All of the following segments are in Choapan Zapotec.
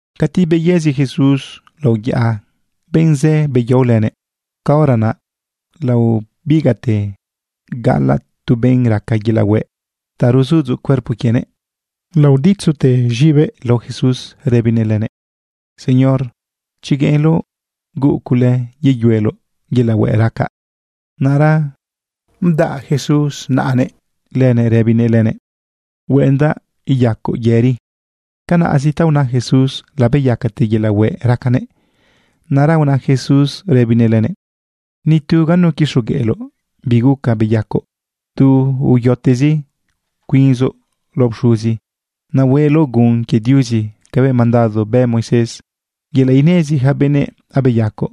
Cati beyëzi Jesús lao yaꞌa, benꞌ zë beyao lënëꞌ. Caora naꞌ laobigaꞌte gaꞌalaꞌ tu benꞌ raca yelaꞌ hueꞌ ta ruzudzoꞌ cuerpo quienëꞌ. Laoditzute z̃ibëꞌ lao Jesús rëbinëꞌ lënëꞌ: ―Señor, chi gueꞌenloꞌ, huuꞌ cule yeyueloꞌ yelaꞌ hueꞌ racaꞌ. Naꞌra udan Jesús naꞌanëꞌ lënëꞌ rëbinëꞌ lënëꞌ: ―Hueꞌendaꞌ iyacoꞌ yëri. Canaꞌzi ta una Jesús, labeyacate yelaꞌ hueꞌ racanëꞌ. Naꞌra una Jesús rëbinëꞌ lënëꞌ: ―Ni tu ganu quixogueꞌloꞌ bi guca beyacoꞌ. Tu uyotezi cuinzoꞌ lao pxuzi. Naꞌ hueꞌloꞌ gun quie Diuzi cabëꞌ mandado bë Moisés yelaꞌ inezi ja benëꞌ abeyacoꞌ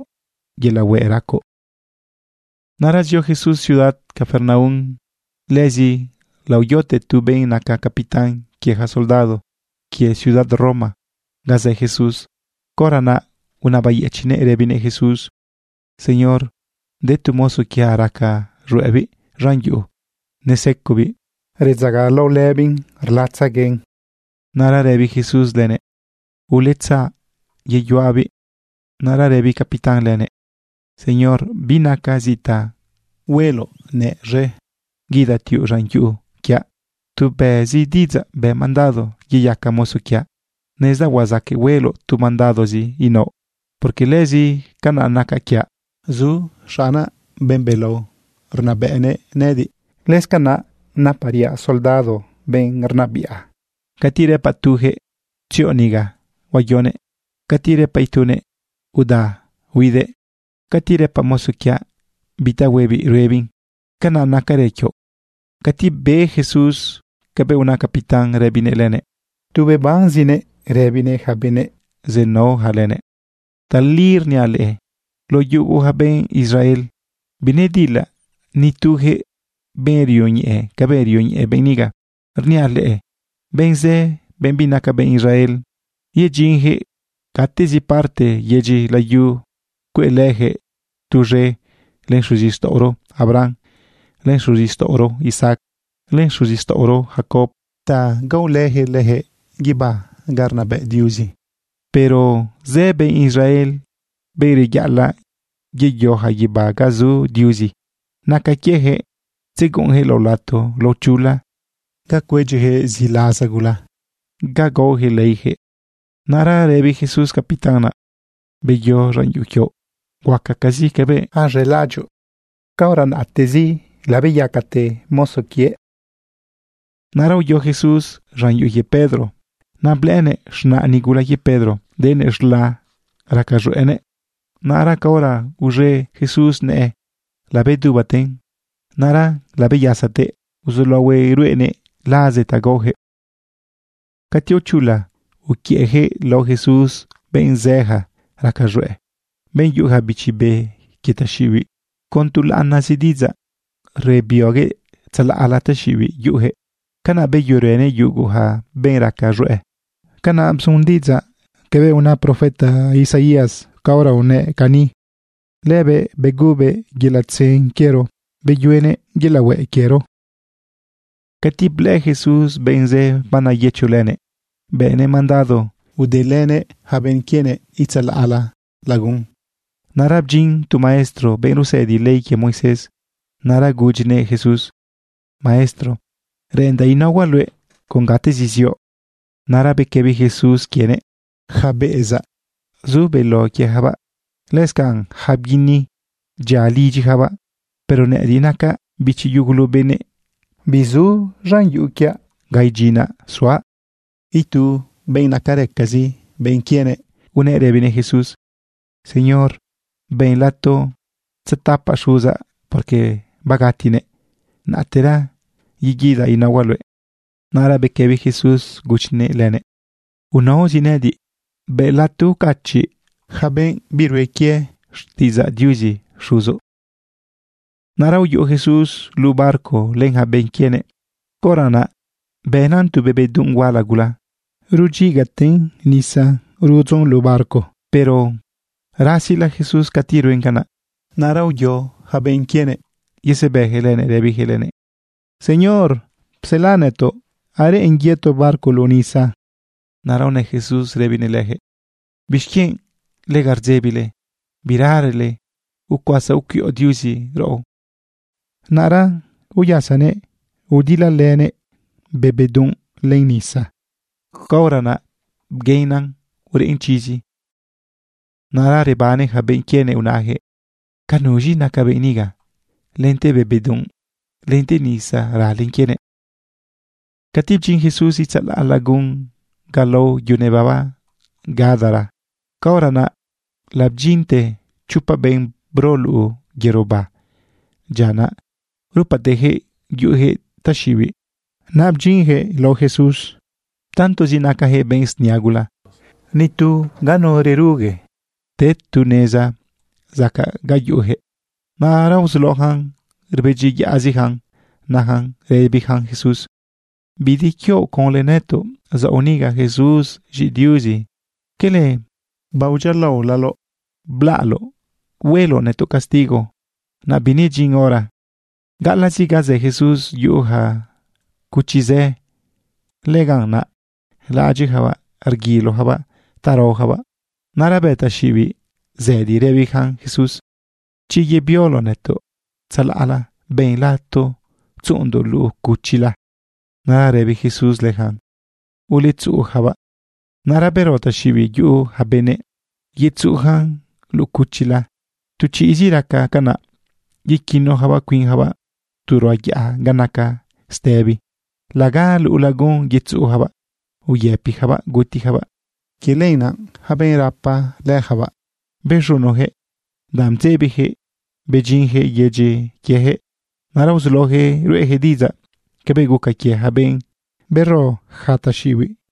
yelaꞌ hueꞌ racoꞌ. Naꞌra zio Jesús ciudad Capernaum. Lëzi laoyote tu benꞌ naca capitán quie ja soldado quie ciudad Roma ga zë Jesús. Caora naꞌ unabayëchiꞌnëꞌ rëbinëꞌ Jesús: ―Señor, de tu mozo quiaꞌ raca z̃hueꞌbiꞌ z̃an yuꞌu. Nesecobiꞌ, redzagalaolëbiꞌn, rlatzeguen. Naꞌra rëbi Jesús lënëꞌ: ―Uletzaꞌ yeyuꞌabiꞌ. Naꞌra rëbi capitán lënëꞌ: ―Señor, binacaꞌ zi ta hueloꞌnëꞌ z̃e guidatiuꞌ z̃an yuꞌu quiaꞌ. Tu bëꞌzi diꞌidzaꞌ, bë mandado yeyaca mozo quiaꞌ. Nezdaꞌ huazaqueꞌ hueloꞌ tu mandadozi inaoꞌ, porque lëzi canaꞌ naca quiaꞌ. Zu xaꞌnaꞌ, benꞌ belao rnabëꞌnëꞌ nëꞌëdiꞌ. Lëscanaꞌ napariaꞌ soldado benꞌ rnabiꞌa. Cati rëpaꞌ tujëꞌ: “Tzioꞌ niga”, huayonëꞌ. Cati rëpaꞌ itunëꞌ: “Uda”, huidëꞌ. Cati rëpaꞌ mozo quiaꞌ bi ta huebiꞌ, ruebiꞌn. Canaꞌ nacarë quioꞌ. Cati be Jesús cabëꞌ una capitán rëbinëꞌ lënëꞌ, tu rebanezinëꞌ rëbinëꞌ ja benꞌ zenaoja lënëꞌ: ―Tali rniaꞌ leꞌe, lao yugu ja benꞌ Israel, binedilaꞌ ni tujëꞌ benꞌ rioñeꞌe cabëꞌ rioñeꞌe benꞌ niga. Rniaꞌ leꞌe, benꞌ zë, benꞌ binaca benꞌ Israel, yedyinjëꞌ gatezi parte yedyi layu cueꞌlëjëꞌ tuz̃e len xuzixtaꞌoro Abraham, len xuzixtaꞌoro Isaac, len xuzixtaꞌoro Jacob ta gaolëjëꞌ lëjëꞌ guibá ga rnabëꞌ Diuzi. Pero zë benꞌ Israel, benꞌ reyaꞌalaꞌ yeyoja guibá ga zu Diuzi, naca quiejëꞌ tzeguꞌunjëꞌ lao lato lao chula ga cuedyijëꞌ ziꞌlaza gula, ga gaojëꞌ leijëꞌ. Naꞌra rëbi Jesús capitán naꞌ: ―Beyo z̃an yuꞌu quioꞌ. Huacacazi cabëꞌ az̃elaꞌadyoꞌ. Caora naꞌtezi labeyacate mozo quiëꞌ. Naꞌra uyo Jesús z̃an yuꞌu quie Pedro. Naꞌ blëꞌënëꞌ z̃naꞌ nigula quie Pedro denëꞌ z̃la, raca z̃hueꞌnëꞌ. Naꞌra caora uz̃e Jesús nëꞌë, labedubaten. Naꞌra labeyasatëꞌ uzulaohuëꞌ ruꞌenëꞌ laze ta gaojëꞌ. Cati aochula, uquiëꞌjëꞌ lao Jesús benꞌ zëja raca z̃hueꞌ, benꞌ yuꞌuja bichi be quie taxiꞌibiꞌ. Con tu laꞌanazi diꞌidzaꞌ rebioguëꞌ tzalaꞌla taxiꞌibiꞌ yuꞌujëꞌ. Canaꞌ beyuerënëꞌ yuguja benꞌ raca z̃hueꞌ. Canaꞌ bzun diꞌidzaꞌ cabëꞌ una profeta Isaías caora unëꞌ cani: “Lëbëꞌ begubëꞌ yelaꞌ tzen quiero, beyuenëꞌ yelaꞌ hueꞌ quiero.” Cati blëꞌë Jesús benꞌ zë baneyëcholënëꞌ, bënëꞌ mandado udelënëꞌ ja benꞌ quienëꞌ itzalaꞌla lagun. Naꞌra bdyin tu maestro, benꞌ rusëdi ley quie Moisés. Naꞌra gudyinëꞌ Jesús: ―Maestro, reꞌendaꞌ inaohuaꞌ luëꞌ con gatezi zioꞌ. Naꞌra bequëbi Jesús quienëꞌ: ―Yaca beꞌezaꞌ, zu beló quiejabaꞌ. Lëscanꞌ ja bguini, dyia lidyijabaꞌ. Pero nëꞌëdiꞌ nacaꞌ bichi yugulu benëꞌ, bizu lidyaꞌ ga idyinaꞌ suaꞌ. Itu benꞌ nacarëcazi benꞌ quienëꞌ unëꞌ rëbinëꞌ Jesús: ―Señor, ben lato tzetapaꞌ xuzaꞌ, porque bagatinëꞌ. Naꞌtera yeguidaꞌ inaohuaꞌ luëꞌ. Naꞌra bequëbi Jesús gudyinëꞌ lënëꞌ: ―Unaozi nëꞌëdiꞌ. Bë lato ucachiꞌ yaca benꞌ birue quie xtiꞌidzaꞌ Diuzi xuzoꞌ. Naꞌra uyuꞌu Jesús luꞌu barco len ja benꞌ quienëꞌ. Caora naꞌ bënan tu be bedunꞌ huala gula, rudyigaten nisa rudzon luꞌu barco. Pero rasila Jesús cati ruen canaꞌ. Naꞌra uyo yaca benꞌ quienëꞌ yesebëjëꞌ lënëꞌ, rëbijëꞌ lënëꞌ: ―¡Señor, psela nëtoꞌ! ¡Areꞌen yëto barco luꞌu nisa! Naꞌra unë Jesús rëbinëꞌ lëjëꞌ: ―¿Bixquienꞌ lega rdzebile? ¡Biralele ucuasa ucuiꞌo Diuzi raꞌo! Naꞌra uyasanëꞌ, udilalënëꞌ be bedunꞌ len nisa. Caora naꞌ bguenan ureꞌn chizi. Naꞌra rebane ja benꞌ quienëꞌ najëꞌ: ―¿Ca nuz̃i naca benꞌ niga? Lente be bedunꞌ, lente nisa ralen quienëꞌ. Cati bdyin Jesús itzalaꞌ lagun ga lao yu nebaba Gadara, caora naꞌ labdyinte chopa benꞌ bro luꞌu yerobá dyia naꞌ. Rupatejëꞌ yuꞌujëꞌ taxiꞌibiꞌ. Naꞌ bdyinjëꞌ lao Jesús. Tantozi nacajëꞌ benꞌ snia gula, ni tu ganu rerugue te tu neza zacaꞌ ga yuꞌujëꞌ. Naꞌra uzulaojan rbedyiyaꞌzijan najan rëbijan Jesús: ―¿Bi de quioꞌ conlë nëtoꞌ zaoꞌ niga, Jesús z̃iꞌi Diuzi? ¿Quele baodyialaolaloꞌ blaꞌloꞌ hueloꞌ nëtoꞌ castigo, naꞌ binedyin hora? Gaꞌalaꞌzi ga zë Jesús yuꞌu ja cuchi zë. Lëganꞌ naꞌ laꞌadyiꞌjabaꞌ rguilojabaꞌ ta raojabaꞌ. Naꞌra bë ja taxiꞌibiꞌ zëdi rëbijan Jesús: ―Chi yebioloꞌ nëtoꞌ tzalaꞌla, ben lato tzuꞌundoꞌ luꞌu cuchila. Naꞌra rëbi Jesús lëjan: ―Uletzuꞌujabaꞌ. Naꞌra bero ja taxiꞌibiꞌ yuꞌu ja benëꞌ yetzuꞌujan luꞌu cuchila. Tu chiꞌzi raca canaꞌ, yequinojabaꞌ cuinjabaꞌ tu ruꞌa yaꞌa ga naca stëbi. Laga luꞌu lagun yetzuꞌujabaꞌ uyëpijabaꞌ gutijabaꞌ. Quie lenaꞌ yaca benꞌ rapa lëjabaꞌ bez̃unojëꞌ danꞌ bdzebijëꞌ bedyinjëꞌ yedyi quiejëꞌ. Naꞌra uzulaojëꞌ ruꞌejëꞌ diꞌidzaꞌ cabëꞌ guca quie ja benꞌ bero ja taxiꞌibiꞌ.